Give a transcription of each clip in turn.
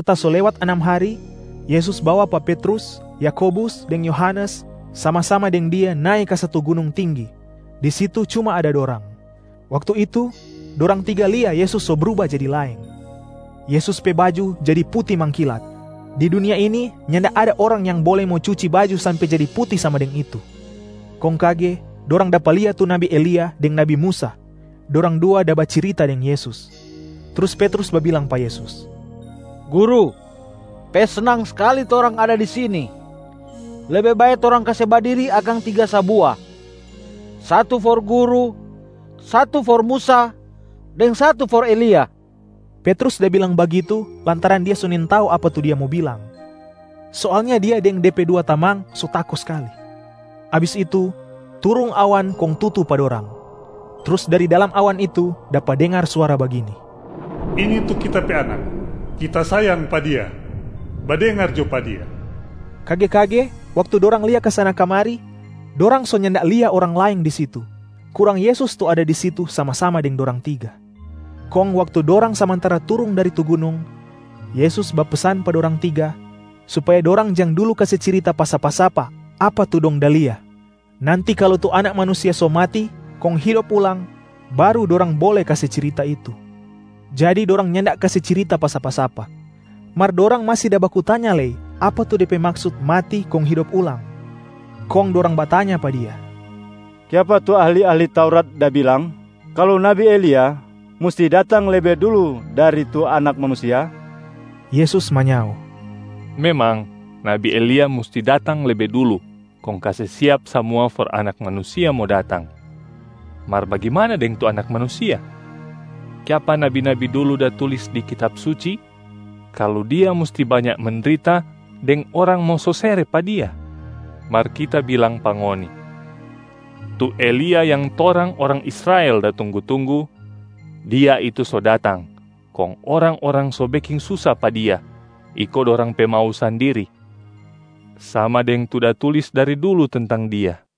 Serta so lewat anam hari, Yesus bawa pa Petrus, Yakobus deng Yohanes sama-sama deng Dia nae ka satu gunung tinggi, di situ cuma ada dorang. Waktu itu dorang tiga lia Yesus so bruba jadi laeng. Yesus pe baju jadi puti mangkilat. Di dunia ini nyanda ada orang yang bole mo cuci baju sampe jadi puti sama deng itu. Kong kage dorang dapa lia tu nabi Elia deng nabi Musa, dorang dua da bacirita deng Yesus. Trus Petrus babilang pa Yesus, “Guru, pe snang skali torang ada di sini. Lebe bae torang kase badiri akang tiga sabua: satu for Guru, satu for Musa, deng satu for Elia.” Petrus da bilang bagitu lantaran dia so nintau apa tu dia mo bilang, soalnya dia deng de pe dua tamang so tako skali. Abis itu, turung awan kong tutu pa dorang. Trus dari dalam awan itu dapa dengar suara bagini, “Ini tu Kita pe Anak, Kita sayang pa Dia. Badengar jo pa Dia!” Kage-kage waktu dorang lia kasana-kamari, dorang so nyanda lia orang laeng di situ, kurang Yesus tu ada di situ sama-sama deng dorang tiga. Kong waktu dorang samantara turung dari tu gunung, Yesus bapesan pa dorang tiga supaya dorang jang dulu kase cirita pa sapa-sapa apa tu dong da lia, nanti kalu tu Anak Manusia so mati kong hidop ulang baru dorang bole kase cirita itu. Jadi dorang nyanda kase cirita pa sapa-sapa, mar dorang masi da baku tanya lei apa tu de pe maksut mati kong hidop ulang. Kong dorang batanya pa Dia, “Kiapa tu ahli-ahli Taurat da bilang kalu nabi Elia musti datang lebe dulu dari tu Anak Manusia?” Yesus manyao, “Memang nabi Elia musti datang lebe dulu kong kase siap samua for Anak Manusia mo datang. Mar bagimana deng tu Anak Manusia? Kiapa nabi-nabi dulu da tulis di Kitab Suci kalu Dia musti banya mendrita deng orang mo sosere pa Dia? Mar Kita bilang pa ngoni, tu Elia yang torang orang Israel da tunggu-tunggu, dia itu so datang kong orang-orang so beking susa pa dia iko dorang pe mau sandiri, sama deng tu da tulis dari dulu tentang dia.”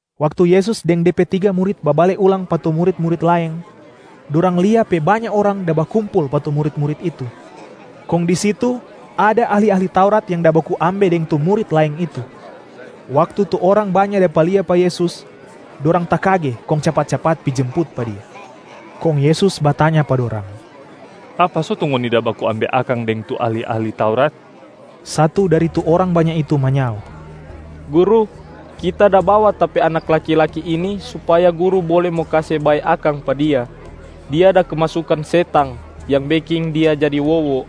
Waktu Yesus deng De pe tiga murit babale ulang pa tu murit-murit laeng, dorang lia pe banya orang da bakumpul pa tu murit-murit itu. Kong di situ ada ahli-ahli Taurat yang da baku ambe deng tu murit laeng itu. Waktu tu orang banya dapa lia pa Yesus, dorang takage kong capat-capat pi jemput pa Dia. Kong Yesus batanya pa dorang, “Apa so tu ngoni da baku ambe akang deng tu ahli-ahli Taurat?” Satu dari tu orang banya itu manyao, “Guru, kita da bawa ta pe anak laki-laki ini supaya Guru bole mo kase bae akang pa dia. Dia da kemasukan setang yang beking dia jadi wowo.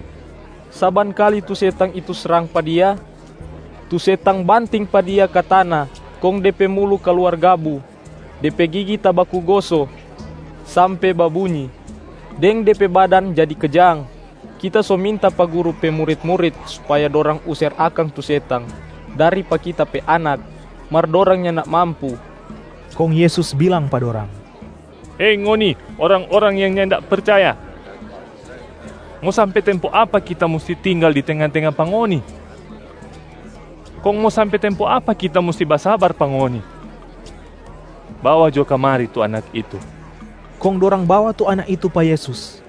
Saban kali tu setang itu srang pa dia, tu setang banting pa dia ka tana kong de pe mulu kaluar gabu, de pe gigi tabaku goso sampe babunyi, deng de pe badan jadi kejang. Kita so minta pa Guru pe murit-murit supaya dorang user akang tu setang dari pa kita pe anak, mar dorang nyanda mampu.” Kong Yesus bilang pa dorang, “Hei ngoni orang-orang yang nyanda percaya. Mo sampe tempo apa Kita musti tinggal di tenga-tenga pa ngoni? Kong mo sampe tempo apa Kita musti mo basabar pa ngoni? Bawa jo kamari tu anak itu!” Kong dorang bawa tu anak itu pa Yesus.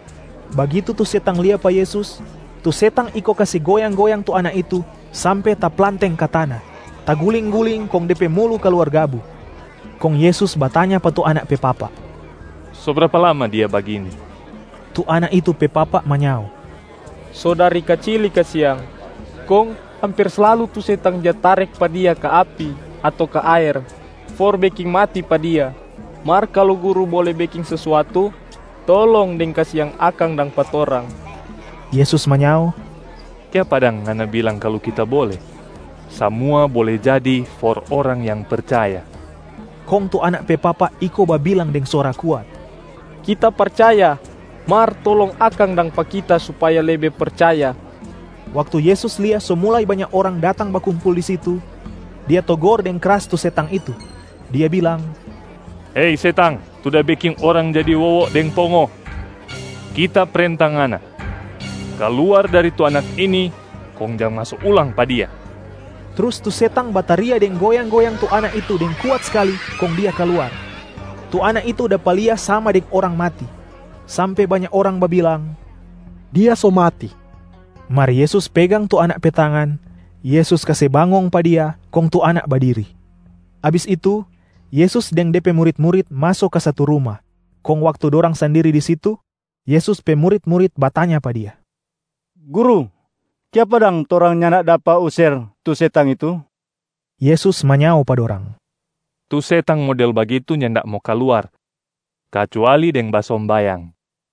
Bagitu tu setang lia pa Yesus, tu setang iko kase goyang-goyang tu anak itu sampe taplanteng ka tana, taguling-guling kong de pe mulu kaluar gabu. Kong Yesus batanya pa tu anak pe papa, “So brapa lama dia bagini?” Tu anak itu pe papa manyao, “So dari kacili kasiang. Kong amper slalu tu setang ja tarek pa dia ka api ato ka aer for beking mati pa dia. Mar kalu Guru bole beking sesuatu, tolong deng kasiang akang dang pa torang.” Yesus manyao, “Kiapa dang ngana bilang kalu Kita bole? Samua bole jadi for orang yang percaya!” Kong tu anak pe papa iko babilang deng suara kuat, “Kita percaya, mar tolong akang dang pa kita supaya lebe percaya.” Waktu Yesus lia so mulai banya orang datang bakumpul di situ, Dia togor deng kras tu setang itu. Dia bilang, “Hei setang tu da beking orang jadi wowo deng pongo. Kita prenta ngana, kaluar dari tu anak ini kong jang maso ulang pa dia!” Trus tu setang bataria deng goyang-goyang tu anak itu deng kuat skali kong dia kaluar. Tu anak itu dapa lia sama deng orang mati, sampe banya orang babilang, “Dia so mati!” Mar Yesus pegang tu anak pe tangan, Yesus kase bangong pa dia, kong tu anak badiri. Abis itu, Yesus deng De pe murit-murit maso ka satu ruma, kong waktu dorang sandiri di situ, Yesus pe murit-murit batanya pa Dia, “Guru, kiapa dang torang nyanda dapa user tu setang itu?” Yesus manyao pa dorang, “Tu setang model bagitu nyanda mo kaluar kacuali deng basombayang.”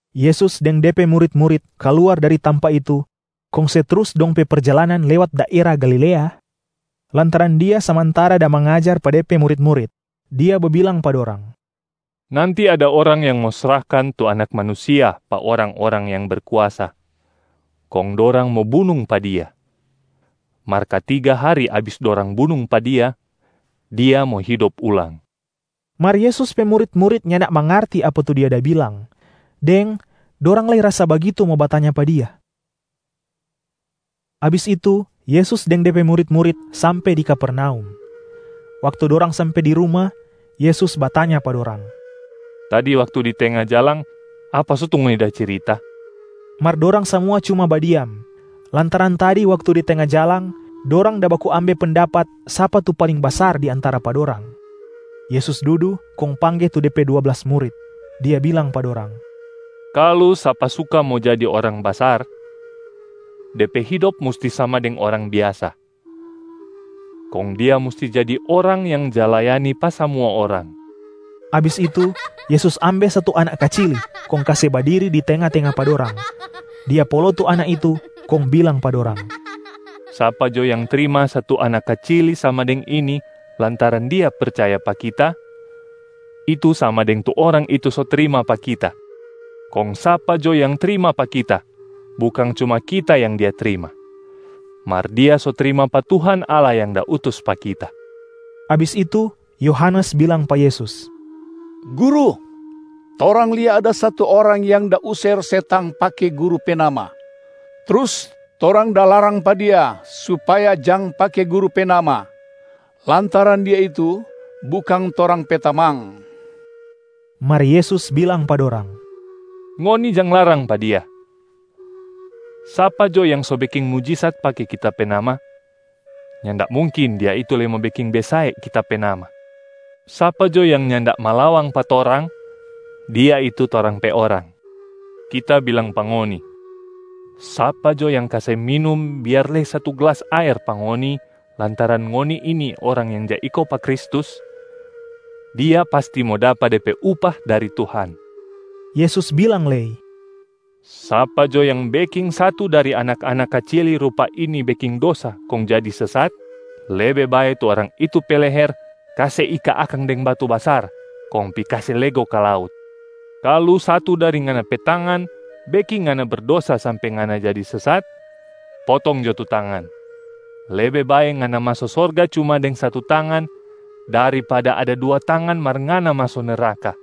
Yesus deng De pe murit-murit kaluar dari tampa itu kong se trus dong pe perjalanan lewat daera Galilea, lantaran Dia samantara da mangajar pa De pe murit-murit. Dia babilang pa dorang, “Nanti ada orang yang mo srahkan tu Anak Manusia pa orang-orang yang berkuasa, kong dorang mo bunung pa Dia. Mar katiga hari abis dorang bunung pa Dia, Dia mo hidop ulang.” Mar Yesus pe murit-murit nyanda mangarti apa tu Dia da bilang, deng dorang lei rasa bagitu mo batanya pa Dia. Abis itu Yesus deng De pe murit-murit sampe di Kapernaum. Waktu dorang sampe di ruma, Yesus batanya pa dorang, “Tadi waktu di tenga jalang, apa so tu ngoni da cirita?” Mar dorang samua cuma badiam, lantaran tadi waktu di tenga jalang, dorang da baku ambe pendapat sapa tu paling basar di antara pa dorang. Yesus dudu kong pangge tu De pe dua blas murit. Dia bilang pa dorang, “Kalu sapa suka mo jadi orang basar, de pe hidop musti sama deng orang biasa, kong dia musti jadi orang yang ja layani pa samua orang.” Abis itu, Yesus ambe satu anak kacili kong kase badiri di tenga-tenga pa dorang. Dia polo tu anak itu kong bilang pa dorang, “Sapa jo yang trima satu anak kacili sama deng ini lantaran dia percaya pa Kita, itu sama deng tu orang itu so trima pa Kita. Kong sapa jo yang trima pa Kita, bukang cuma Kita yang dia trima, mar dia so trima pa Tuhan Allah yang da utus pa Kita.” Abis itu Yohanes bilang pa Yesus, “Guru, torang lia ada satu orang yang da user setang pake Guru pe nama. Trus torang da larang pa dia supaya jang pake Guru pe nama, lantaran dia itu bukang torang pe tamang.” Mar Yesus bilang pa dorang, “Ngoni jang larang pa dia! Sapa jo yang so beking mujisat pake Kita pe nama, nyanda mungkin dia itu lei mo beking besae Kita pe nama. Sapa jo yang nyanda malawang pa torang, dia itu torang pe orang. Kita bilang pa ngoni, sapa jo yang kase minum biar lei satu glas aer pa ngoni lantaran ngoni ini orang yang ja iko pa Kristus, dia pasti mo dapa de pe upah dari Tuhan.” Yesus bilang lei, “Sapa jo yang beking satu dari anak-anak kacili rupa ini beking dosa kong jadi sesat, lebe bae tu orang itu pe leher kase ika akang deng batu basar kong pi kase lego ka laut. Kalu satu dari ngana pe tangan beking ngana berdosa sampe ngana jadi sesat, potong jo tu tangan! Lebe bae ngana maso sorga cuma deng satu tangan, daripada ada dua tangan mar ngana maso neraka.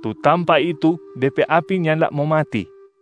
Tu tampa itu de pe api nyanda mo mati. [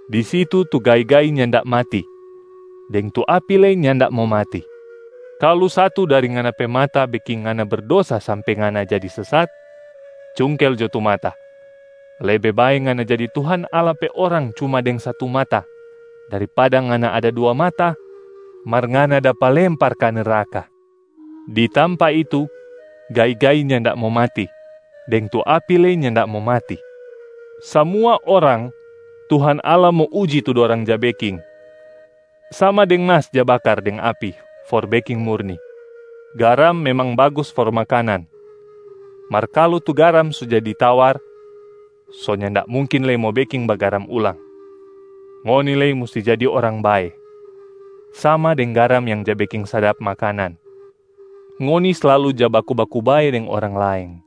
Di situ tu gai-gai nyanda mati, deng tu api lei nyanda mo mati.] Kalu satu dari ngana pe mata beking ngana berdosa sampe ngana jadi sesat, cungkel jo tu mata! Lebe bae ngana jadi Tuhan Allah pe orang cuma deng satu mata, daripada ngana ada dua mata mar ngana dapa lempar ka neraka. Di tampa itu, gai-gai nyanda mo mati, deng tu api lei nyanda mo mati. Samua orang Tuhan Allah mo uji tu dorang ja beking, sama deng mas ja bakar deng api for beking murni. Garam memang bagus for makanan, mar kalu tu garam so jadi tawar, so nyanda mungkin lei mo beking bagaram ulang. Ngoni lei musti jadi orang bae, sama deng garam yang ja beking sadap makanan, ngoni slalu ja baku-baku bae deng orang laeng.”